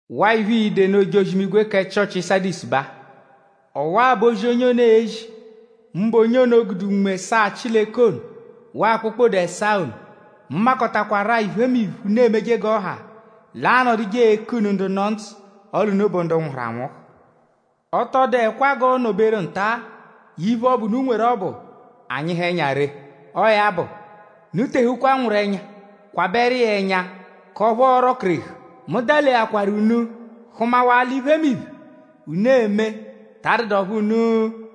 “Waa iphe, ii-de nụ ojozi-imigwe kẹ Chịochi Sadisu baa: “Ọwa-a bụ ozi, onye ono ezi; mbụ onye ono gude Unme ẹsaa Chileke ono waa kpokpode ẹsaa ono. Mu makọtakwaru-a iphemiphe, unu emeje g'ọ ha. L'aanọduje eku unu ndu nọ ndzụ; ọle unu bụ ndu nwụhuru anwụhu. Ọ tọ dụekwa g'ọo-nọ-beru nta-a iphe ọbu, unu nweru ọbu anyịhu ẹnya ree. Ọo ya bụ; unu tehukwa nwụru ẹnya; kwabẹru iya ẹnya k'ọphu ọo-rọ-kerehu. Mu daleakwaru unu hụmawaa l'iphemiphe, unu eme ta adụdu ọphu unu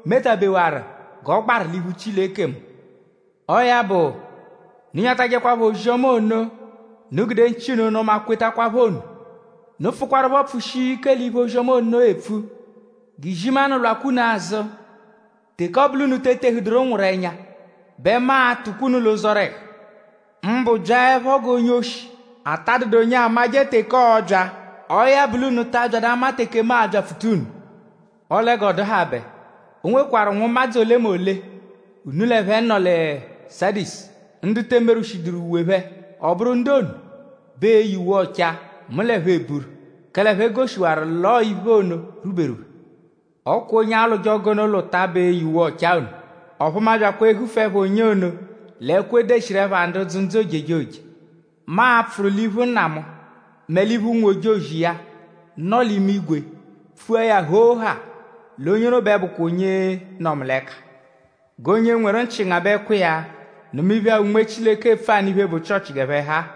metabewaru g'ọ gbaru l'iphu Chileke mu. Ọo ya bụ; unu nyatajẹkwapho ozi-ọma ono, unu gude nchị unu nụma kwetakwaphọ ono. Unu pfụkwarupho pfụshia ike l'iphe ozi-ọma ono epfu. G'izimanụ lwakwa unu azụ. Teke ọ bụ l'unu te etehuduru nwụru ẹnya bẹ mu a-tụkwa unu l'ụzorehu; mbụ byaẹpho g'onye-oshi, ata dụdu onye amajẹ teke ọobya. Ọo ya bụ l'unu ta abyadụ ama teke mu a-byapfuta unu. Ọle g'ọ dụhabe; o nwekwarụ nwụmadzu olemole, unu l'ẹphe nọ lẹ Sadisu; ndu te emerwụshiduru uwe phẹ. Ọ bụru ndu ono bẹ e-ye uwe ọchaa; mu l'ẹphe eburu; kẹle ẹphe goshiwaru l'ọo iphe ono rwuberu phẹ. Ọ kwa onye alwụje ọgu ono lwụta bẹ e-ye uwe ọchaa ono. Ọphu mu abyakwa ehufu ẹpha onye ono l'ẹkwo, e deshiru ẹpha ndu dzụ ndzụ ojejoje. Mu a-pfụru l'iphu Nna mu; mẹ l'iphu ụnwu-ojozi iya, nọ l'imigwe; pfua ya hoo haa l'onye ono bẹ bụkwa onye nọ mu l'ẹka. “ ‘G'onye nweru nchị ngabẹkwa iya; nụma iphe-a, Unme Chileke epfu anụ iphe, bụ Chịochi g'ẹphe ha-a.’”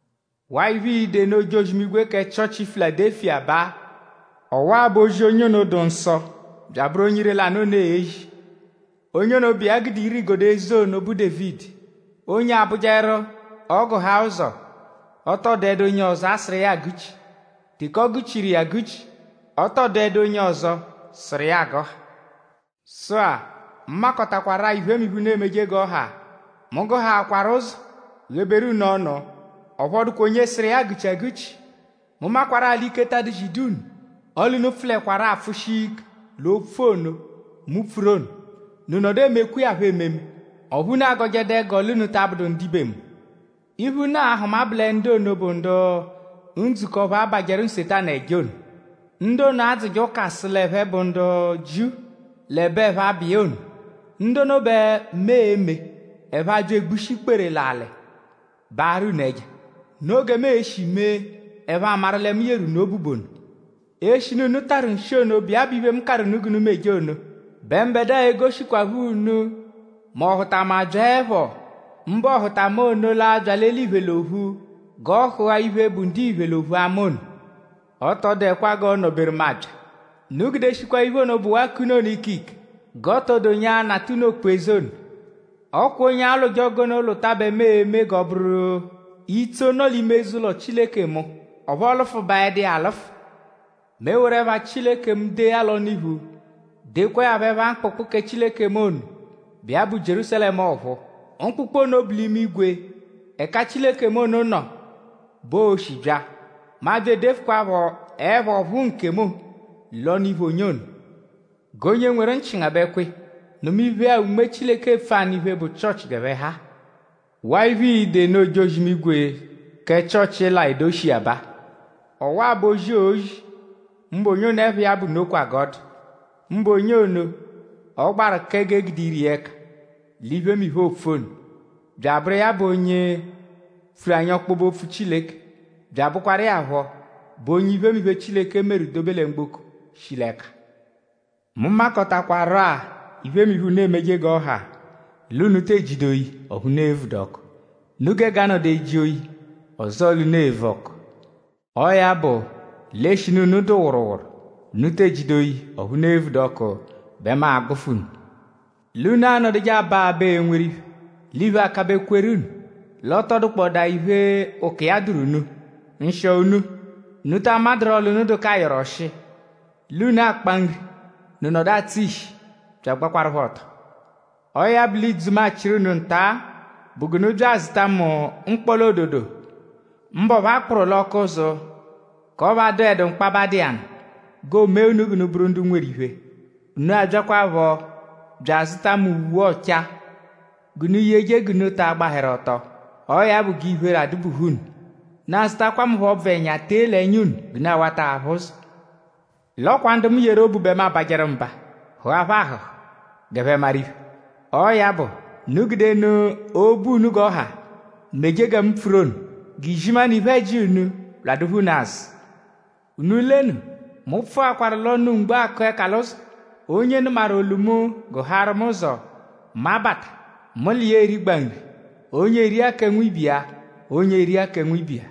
Waa iphe, ii-de nụ ojozi-imigwe kẹ Chịochi Filadelufiya baa: “Ọwa-a bụ ozi, onye ono, dụ nsọ bya abụru onye ire-lanụ ono ezi. Onye ono, bụ iya gude ire-igodo eze ono, bụ Dévidi. Onye abụjeru: ọ -gụhaa ụzo; ọ tọ dụedu onye ọzo asụru iya agụ-chi; teke ọ gụ-chiru iya agụ-chi; ọ tọ dụedu onye ọzo sụru iya agụha. Sụ-a; mu makọtakwaru-a iphemiphe, unu emeje g'ọ ha. Mu gụhaakwaru ụzo gheberu unu ọnu; ọphu ọ dụkwa onye sụru iya agụ-chi agụ-chi. Mu makwarụ-a l'ike ta adụ-zidu unu; ọle unu pfụlekwaru-a pfụ-shia ike l'opfu ono, mu pfuru ono; unu nọdu emekwa iya phọ ememe; ọphu unu agọjedu ẹgo l'unu ta abụdu ndibe mu. “Iphe unu a-hụma bụ lẹ ndu ono bụ ndu ndzukọ ọphu abajẹru Nsetanu ẹja ono; ndu ono adzụje ụka sụ l'ẹphe bụ ndu Jiu l'ẹbe ẹphe abụ iya ono; ndu ono bẹ mu e-me: ẹphe abya egbushi ikpere l'alị baarụ unu ẹja. Noo gẹ mu e-shi mee: ẹphe amaru lẹ mu yeru unu obu bụ ono. Eshinu unu tarụ nshi ono, bụ iya bụ iphe, mu karụ unu g'unu meje ono; bẹ mbẹdua e-gudeshikwaphọ unu mẹ ọhutama -byaẹpho; mbụ ọhutama ono l'abya l'eliphe l'ophu; g'ọ hụa iphe, bụ ndiphe l'ophu ama ono. Ọ tọ dụekwa g'ọo-nọ-beru mu abya. Unu gudeshikwa iphe ono, bụwaa k'unu ono ikike g'ọ tọ dụ onye l'anata unu okpu-eze ono. Ọ kwa onye alwụje ọgu ono lwụta bẹ mu e-me g'ọ bụru itso nọ l'ime eze-ụlo Chileke mu; ọphu ọo-lụfubaedu iya alụfu. Mu eworu ẹpha Chileke mu dee ya l'ọnu-iphu; dekwaa ya phọ ẹpha mkpụkpu kẹ Chileke mu ono, bụ iya bụ Jierúsalẹmu ọ̀phúú. Mkpụkpu ono bụ l'imigwe ẹka Chileke mu ono nọ bẹ oo-shi bya. Mu abya edefụkwaa phọ ẹpha ọ̀phúú nkemu l'ọnu-iphu onye ono. “G'onye nweru nchị ngabẹkwa iya; nụma iphe-a, Unme Chileke epfu anụ iphe, bụ Chịochi g'ẹphe ha-a. “Waa iphe, ii-de nụ ojozi-imigwe kẹ Chịochi Layodeshiya baa: “Ọwa-a bụ ozi, oozi; mbụ onye ono, ẹpha iya bụ: Nokwa g'ọ dụ”; mbụ onye ono, ọ gbaru kẹ g'e gude ire iya ẹka l'iphemiphe, oopfu ono; bya abụru iya bụ onye pfuru anyi ọkpobe-opfu Chileke; bya abụkwaru iya phọ bụ onye iphemiphe, Chileke meru dobe lẹ mgboko shi l'ẹka. Mu makọtakwaru-a iphemiphe, unu emeje g'ọ ha; l'unu te ejidu oyi ọphu unu evudu ọku. Unu gege anọdu eji oyi; ọzoo l'unu evu ọku. Ọo ya bụ; l'eshinu unu dụ wụruwuru; unu te ejidu oyi ọphu unu evudu ọku bẹ mu a-gbụfu unu. L'unu anọduje aba abaa enweru iphe; l'iphe akabẹ kweru unu; l'ọ tọ dụkpodaa iphe ụko iya dụru unu. Nshịo unu; unu ta amadurọ l'unu dụ k'ayọru ọshi; l'unu akpa nri; unu nọdu atsụ ishi bya agbakwarụ phọ ọto. Ọo ya bụ l'ìdzù, mu a-chịru unu nta-a bụ g'unu bya azụta mu mkpọla-ododo mbụ ọphu a kpụru l'ọku-ụzu; k'ọphu adụedu mkpaba dụ iya nụ; g'oo-mee unu g'unu bụru ndu nweru iphe; unu abyakwaphọ bya azụta mu uwe ọchaa g'unu yeje g'unu ta agbahẹru ọto; ọo ya bụ g'iphere adụ-buhu unu. Unu azụtakwa mu phọ ọbvu ẹnya tee l'ẹnya ono g'unu awata aphụ ụzo. L'ọ kwa ndu mu yeru obu bẹ mu abajẹru mba; hụa phẹ ahụ̀hù; g'ẹphe maru iphe. Ọo ya bụ; unu gude nụ obu unu g'ọ ha meje gẹ mu pfuru ono; g'izimanụ iphe-ẹji unu lwadụpho unu azụ. Unu lenu; mu pfụakwaru l'ọnu mgbo akụ ẹka l'ụzo. Onye nụmaru olu mu; gụhaaru mu ụzo; mu abata; mu l'iya erigba nri; onye eria kẹ nwibe iya; onye eria kẹ nwibe iya.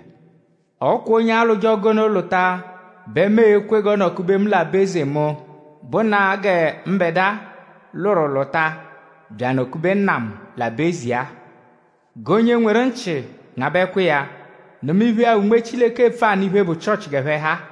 Ọ kwa onye alwụje ọgu ono lwụta bẹ mu e-kwe g'ọ nọ-kube mu l'aba-eze mu; bụnaa gẹ mbẹdua lwụru lwụta bya anọ-kube Nna mu l'aba-eze iya-a. “G'onye nweru nchị ngabẹkwa iya; nụma iphe-a, Unme Chileke epfu anụ iphe, bụ Chịochi g'ẹphe ha-a.”